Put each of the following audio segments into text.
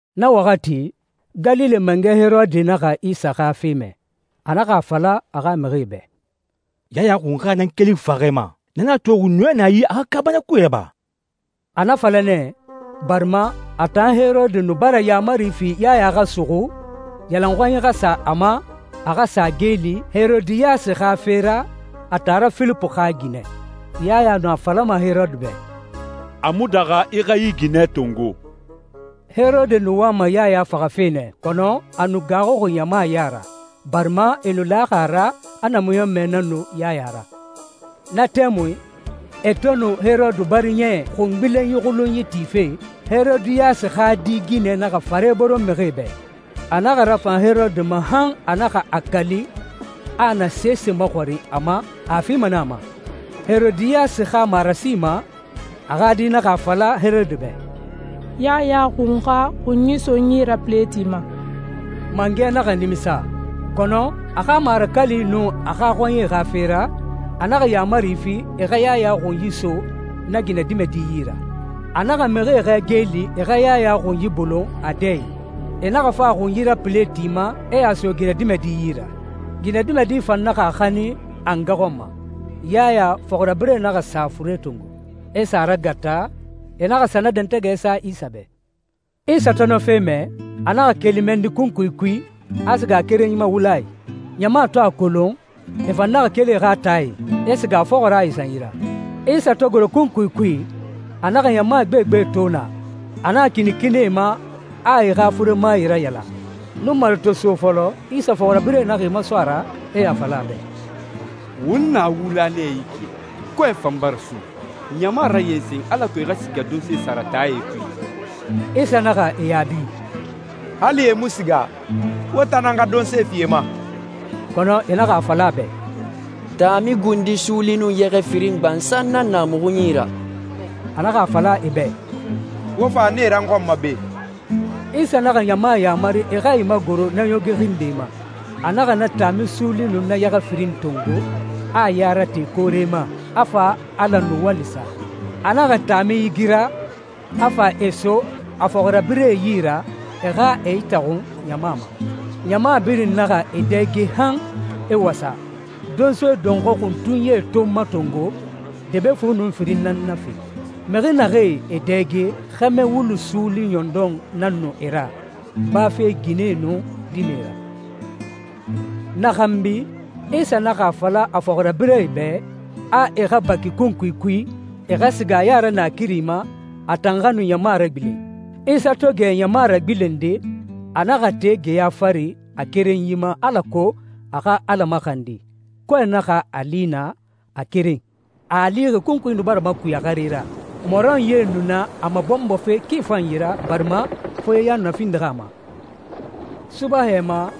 Na waxati, Galile mangɛ Herode naxa Isa xa fe mɛ. A naxa a fala a xa mixie bɛ, «Yaya Xunxa nan kelixi faxɛ ma. Na nan a toxi nɔɛ na a yi a xa kaabanakoe raba.» A na fala nɛ, barima a tan Herode nu bara yaamari fi Yaya xa suxu, yɔlɔnxɔnyi xa sa a ma, a xa sa geeli Herodiyasi xa fe ra, a taara Filipu xa ginɛ. Yaya nu a falama Herode bɛ, «A mu daxa i xa yi ginɛ tongo.» Herode nu wama Yaya faxafe nɛ, kɔnɔ a nu gaaxuxi ɲama ya ra, barima e nu laxi a ra a namiɲɔnmɛ nan nu Yaya ra. Na tɛmui, e to nu Herode bari ɲɛ xungbilenyi xulunyi tife, Herodiyasi xa di ginɛ naxa fare boron mixie bɛ. A naxa rafan Herode ma han a naxa a kali a a na sese maxɔrin a ma, a a fima nɛ a ma. Herodiyasi xa marasi ma, a xa di naxa a fala Herode bɛ, «Yaya Xunxa xunyi so n yi ra pileti ma.» Mangɛ naxa nimisa, kɔnɔ a xa marakali nun a xa xɔɲɛe xa fe ra, a naxa yaamari fi e xa Yaya xunyi so na ginɛdimɛdi yi ra. A naxa mixie xɛɛ geeli, e xa Yaya xunyi bolon a dɛ i. E naxa fa a xunyi ra pileti ma, e a so ginɛdimɛdi yi ra. Ginɛdimɛdi fan naxa a xanin a nga xɔn ma. Yaya fɔxirabirɛe naxa sa a fure tongo, e sa a ragata, e naxa sa na dɛntɛgɛ sa Isa bɛ. Isa to na fe mɛ, a naxa keli mɛnni kunkui kui, a siga a kerenyi ma wula i. Ɲama to a kolon, e fan naxa keli e xa taae, e siga a fɔxɔ ra e sanyi ra. Isa to goro kunkui kui, a naxa ɲama gbegbe to naa. A naxa kinikini e ma, a e xa furemae rayalan. Nunmare to so fɔlɔ, Isa fɔxirabirɛe naxa e maso a ra, e a fala a bɛ, «Won na wula nɛ yi ki, kɔɛ fan bara so. Ɲama rayensen alako e xa siga donse sara taae kui.» Isa naxa e yaabi, «Hali e mu siga. Wo tan nan xa donse fi e ma.» Kɔnɔ e naxa a fala a bɛ, «Taami gundi suuli nun yɛxɛ firin gbansan nan na muxu yi ra.» A naxa a fala e bɛ, «Wo fa nee ra n xɔn ma be.» Isa naxa ɲama yamari e xa e magoro na ɲooge xinde ma. A naxa na taami suuli nun na yɛxɛ firin tongo, a a ya rate koore ma, a fa Ala nuwali sa. A naxa taamie igira, a fa e so a fɔxirabirɛe yi ra, e xa e itaxun ɲama ma. Ɲama birin naxa e dɛge han e wasa. Donse dɔnxɔɛ xuntunyie to matongo, debe fu nun firin nan nafe. Mixi naxee e dɛge, xɛmɛ wulu suuli ɲɔndɔn nan nu e ra, bafe ginɛe nun dimɛe ra. Na xanbi Isa naxa a fala a fɔxirabirɛe bɛ, a e xa baki kunkui kui, e xa siga a ya ra naakiri ma, a tan xa nu ɲama ragbilen. Isa to gɛ ɲama ragbilende, a naxa te geya fari a kerenyi ma, alako a xa Ala maxandi. Kɔɛ naxa a li naa, a keren. A a lixi kunkui nu bara makuya xare ra, mɔrɔnyie nu na a mabɔnbɔfe ki fanyi ra barima foye ya nu rafindixi a ma. Subaxɛ ma,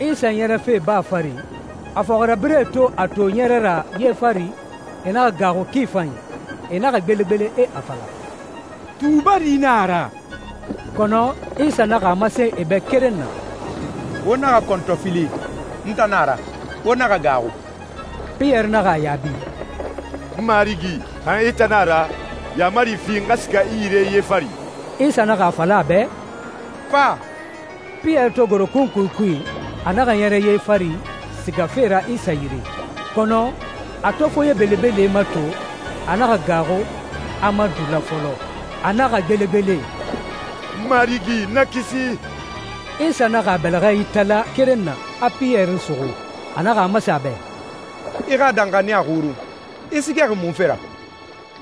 Isa ɲɛrɛfe baa fari. A fɔxirabirɛe to a to ɲɛrɛ ra ye fari, e naxa gaaxu ki fanyi. E naxa gbelegbele, e a fala, «Tubari nan a ra!» Kɔnɔ Isa naxa a masen e bɛ keren na, «Wo naxa kɔntɔfili, n tan nan a ra. Wo naxa gaaxu.» Piyɛri naxa a yaabi, «Marigi, xa i tan nan a ra, yaamari fi n xa siga i yire ye fari.» Isa naxa a fala a bɛ, «Fa.» Piyɛri to goro kunkui kui, a naxa ɲɛrɛ ye fari sigafe ra Isa yire. Kɔnɔ a to foye belebele mato, a naxa gaaxu, a madula fɔlɔ. A naxa gbelegbele, «N Marigi, n nakisi!» Isa naxa a bɛlɛxɛ itala keren na, a Piyɛri suxu. A naxa a masen a bɛ, «I xa danxaniya xurun. I siikɛxi munfe ra?»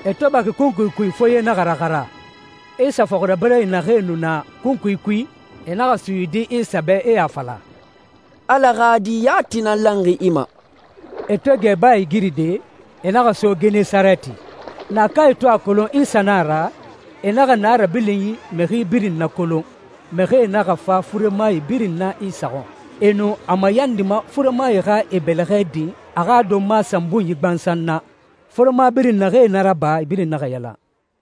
E to baki kunkui kui, foye naxa raxara. Isa fɔxirabirɛ naxee nu na kunkui kui, e naxa suyidi Isa bɛ, e a fala, «Ala xa Di yati nan lanxi i ma.» E to gɛ baa igiride, e naxa so Genesareti. Naakae to a kolon Isa nan a ra, e naxa na rabilinyi mixi birin nakolon. Mixie naxa fa furemae birin na Isa xɔn. E nu a mayandima furemae xa e bɛlɛxɛ din a xa donma sanbunyi gbansan na. Furema birin naxee na raba, e birin naxa yalan.